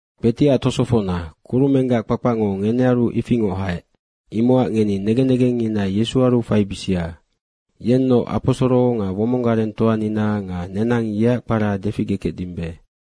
Kpetiac tosofocna, kurumenggac kpakpacngo ngenearu ifingoc haec. Imocac ngeni negen negengngina Yesuaru faibisia. Yenoc aposoro nga womong garengtoanina nga nenang yeac kpara deficgekecdimbe.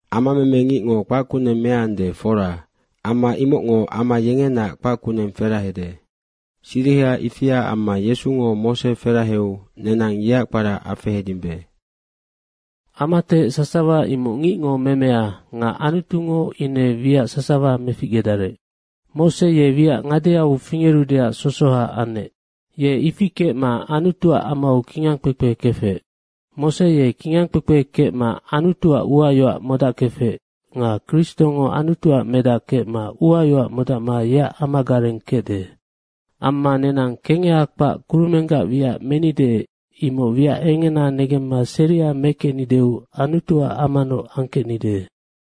Ama memengicngo kpac kuneng meande, fora. Amma imocngo ama yengenaac kpac kuneng ferahade. Siriha ifia amma Yesungo Mose feraheu nenang yeac kpara afehedimbe. Amatehec sasawa imoc ngicngo memea nga Anutungo ine wiac sasawa meficgedarec. Mose ye wiac ngadeau fingerudeac sosoha anec. Ye ifi kecma Anutuac amau kingangkpekpe kefec. Mose ye kingangkpepe kecma Anutuac uayoac modackefec nga Kristongo Anutuac Medac kecma uayoac modacma yeac amagareng kecde. Amma nenang kengeha kpac kurumenggac wiac menide, imoc wiac engena negemma serima mekecnideu Anutuac amanoc angkecnide.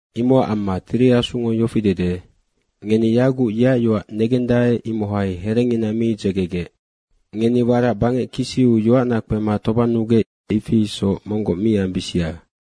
Imocac amma Tiri Asungo yofi dede, “Ngeni yaguc yeac yoac negendae, imohai herengina mi dzegegec. Ngeni warac bangec kisiu yoacna kpema tobannugec, ifi isoc monggoc mi ambisia.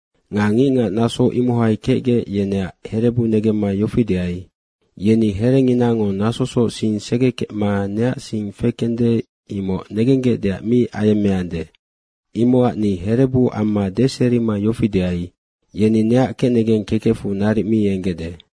Nga ngicngac naso imohai kecgec, yeneac herebu negemma yofi deai, ‘Yeni herenginango nasosoc sing segekecma neac sing fekende, imoc negenggecdeac mi ayemmeande.’ Imocac ni herebu amma deserima yofi deai, ‘Yeni neac kecnegeng kekecfu naric mi enggecde.’”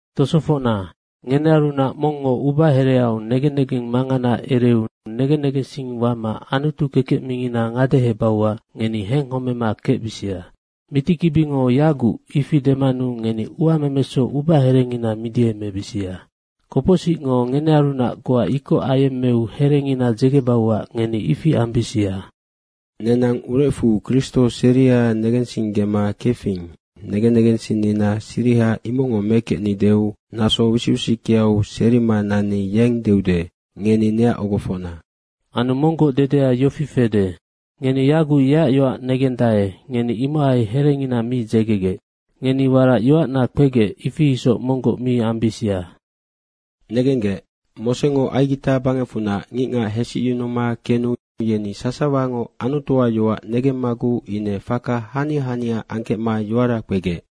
Tosofocna, ngenearunac mongngo ubahereau negen negeng mangana ereu negen negensing wama Anutu kekec mingina ngadehebauac ngeni henghomema kecbisia. Mitikibingo “yaguc” ifi demanu ngeni uamemesoc ubaherengina midiemebisia. Kopocsicngo ngenearunac goa ikoc ayemmeu herengina dzegebauac ngeni ifi ambisia. Nenang urecfu Kristo seria negensinggema kefing, negen negensinnina siriha imocngo mekecnideu naso wisic wisickeau serima nanni yeng deude, “Ngeni neac ogofocna.” Anu monggoc dedea yofi fede, “Ngeni yaguc yeac yoac negendae, ngeni imohai herengina mi dzegegec. Ngeni warac yoacna kpegec, ifi isoc monggoc mi ambisia.” Negenggec, Mosengo Aigita bangecfunac ngicngac hesicyunuma kenu yeni sasawango Anutuac yoac negemmaguc ine faka hania hania angkecma yoara kpegec.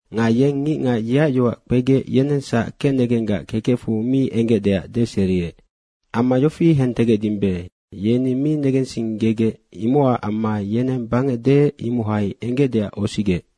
Nga yeng ngicngac yeac yoac kpegec, yenengsac kecnegenggac kekecfu mi enggecdeac deseriec. Amma yofi hentegecdimbe, yeni mi negensinggegec, imocac amma yeneng bangec deec, imohai enggecdeac osigec.